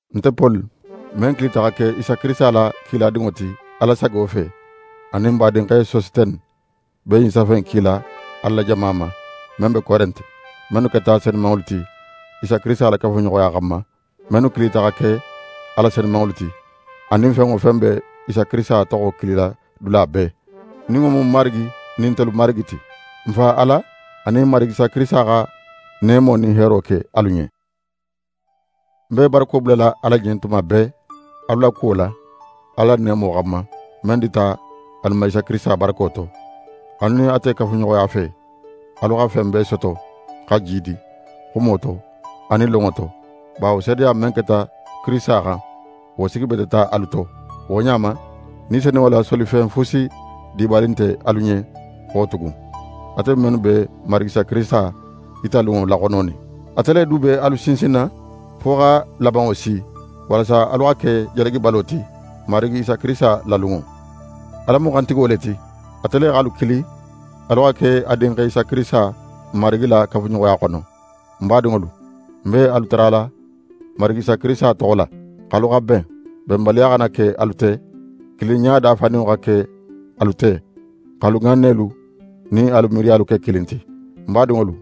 Nte Poli, men kilita xa ke Isa Kirisita la kiladinŋo ti Ala sago fe, anin n badinxe Sositene, be ɲin safe in kila Ala la jama ma, men be Korente, mennu keta senumanŋolu ti Isa Kirisita la kafuɲoxoya xanma, mennu kilita xa ke a la senumanŋolu ti, anin fen wo fen be Isa Kirisita toxo kilila dula bee, nin wo mu i Marigi nin ntelu Marigi ti. N Fa Ala anin Marigi Isa Kirisita xa neemo nin heero ke alu ɲen. Ń be barako bulala Ala ɲen tuma bee alu la kuwo la, Ala la neemo xanma, men dita alu ma Isa Kirisita barako to. Alu nin ate kafuɲoxoya fe, alu xa fen bee soto xa jiidi, xumo to anin lonŋo to, bawo seedeya men keta Kirisita xan, wo sigibeteta alu to. Wo ɲa ma, Ni Senunŋo la solifen fusi dibali nte alu ɲen xo tugun, atelu mennu be n Marigi Isa Kirisita yitalunŋo laxononin. Ate le du be alu sinsinna fo xa labanŋo si, walasa alu xa ke jalagibalo ti Marigi Isa Kirisita la lunŋo. Ala mu xantigo le ti. Ate le x'alu kili alu xa ke a Dinxe Isa Kirisita, n Marigi la kafuɲoxoya xono. Ń badinŋolu, ń be alu tarala Marigi Isa Kirisita toxo la, x'alu xa ben, benbaliya xana ke alu te. Kilinɲa dafaninŋo xa ke alu te, x'alu ŋannelu nin alu miiriyalu ke kilin ti. Ń badinŋolu,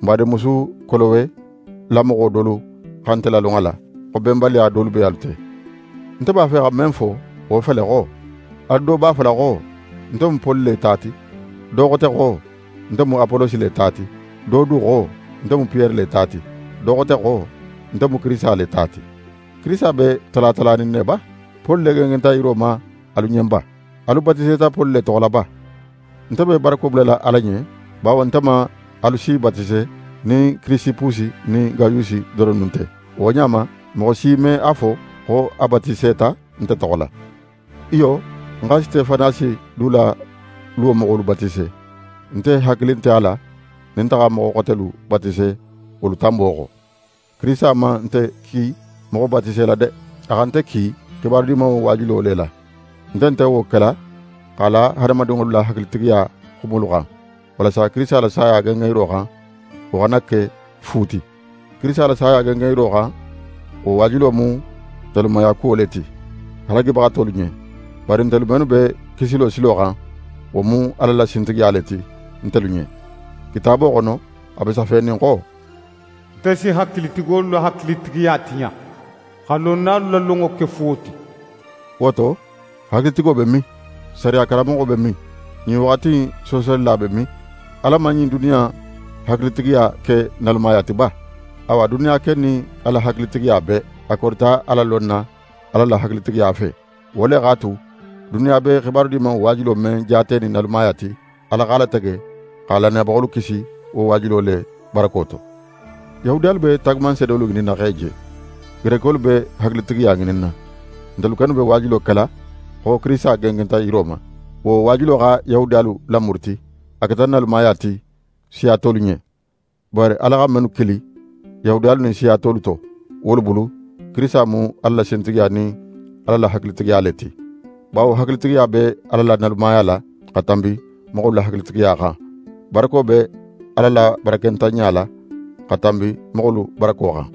n badinmusu Kolowe la moxo dolu xa nte lalon a la, xo benbaliya dolu be alu te. Nte b'a fe xa men fo, wo fele xo: «Alu do b'a fola xo: “Nte mu Poli le ta ti.” Do xote xo: “Nte mu Apolosi le ta ti.” Do du xo: “Nte mu Piyere le ta ti.” Do xote xo: “Nte mu Kirisita le ta ti.” Kirisita be tala talanin ne ba? Poli le gengenta yiro ma alu ɲen ba? Alu batiseta Poli le toxo la ba?» Nte be barako bulala Ala ɲen bawo nte man alu si batise nin Kirisipusi nin Gayusi doronnu nte. Wo ɲa ma, moxo si me a fo xo a batiseta nte toxo la. Iyo, ń xa Sitefanasi du la luwo moxolu batise. Nte hakili nte a la nin nte xa moxo xotelu batise wolu tanbo xo. Kirisita man nte ki moxo batise la de! A xa nte ki xibaru Dimanŋo waajulo le la. Nte nte wo kela x'a la hadamadinŋolu la hakilitigiya xumolu xan, walasa Kirisita la saya gengenyiro xan, wo xana ke fu ti. Kirisita la saya gengenyiro xan, wo waajulo mu nalumayakuwo le ti halagibaxatolu ɲen; bari ntelu mennu be kisilo silo xan, wo mu Ala la sintigiya le ti, ntelu ɲen. Kitaabo xono, a be safenin xo: «Nte si hakilitigolu la hakilitigiya tiɲa, xa lonnalu la lonŋo ke fuwo ti.» Wo to, hakilitigo be min? Sariya karanmoxo be min? Ɲin waxati in soosolila be min? Ala man ɲin duniya in hakilitigiya ke nalumaya ti ba? Awa duniya ken nin a la hakilitigiya bee, a korita Ala lonna Ala la hakilitigiya fe. Wo le x'a tu, duniya be xibaru Dimanŋo waajulo men jaatenin nalumaya ti, Ala x'a latege xa lannayabaxolu kisi wo waajulo le barako to. Yahudiyalu be taagumanseedolu ŋininna x'e je, Gerekolu be hakilitigiya ŋininna. Ntelu kennu be waajulo kela xo Kirisita gengenta yiro ma. Wo waajulo xa Yahudiyalu lamuruti, a keta nalumaya ti siya tolu ɲen. Bari Ala xa mennu kili, Yahudiyalu nin siya tolu to, wolu bulu, Kirisita mu Ala la sintigiya nin Ala la hakilitigiya le ti. Bawo hakilitigiya be Ala la nalumaya la, xa tanbi moxolu la hakilitigiya xan. Barako be Ala la barakentanɲa la, xa tanbi moxolu barako xan.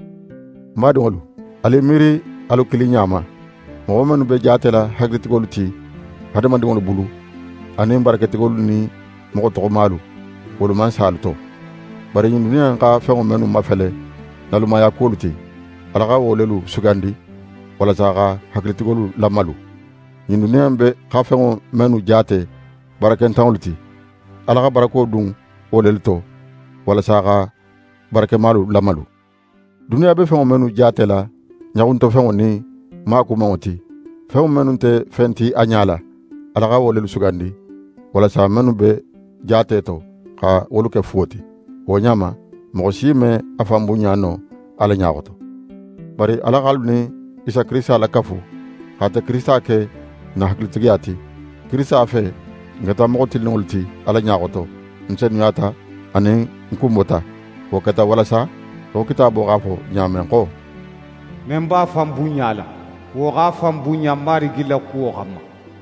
Ń badinŋolu, alu i miiri alu kiliɲa ma. Moxo mennu be jaatela hakilitigolu ti hadamadinŋolu bulu, anin baraketigolu nin moxo toxomalu, wolu man sa alu to. Bari ɲin duniya in xa fenŋo mennu mafele nalumayakuwolu ti, Ala xa wo lelu sugandi, walasa xa hakilitigolu lamalu. Ɲin duniya in xa fenŋo mennu jaate barakentanŋolu ti, Ala xa barako dun wo lelu to, walasa xa barakemalu lamalu. Duniya be fenŋo mennu jaatela ɲaxuntofenŋo nin maakumanŋo ti, fenŋo mennu nte fen ti a ɲala, Ala xa wo lelu sugandi, walasa mennu be jaate to, xa wolu ke fuwo ti. Wo ɲa ma, moxo si me a fan bunɲa no Ala ɲa xoto. Bari Ala x'alu nin Isa Kirisita lakafu, x'ate Kirisita ke n na hakilitigiya ti. Kirisita fe, n keta moxo tilinninŋolu ti Ala ɲa xoto, n senuyata, anin n kunbota. Wo keta walasa, í xo Kitaabo x'a fo ɲa men xo: «Men b'a fan bunɲala, wo x'a fan bunɲa Marigi la kuwo xanma.»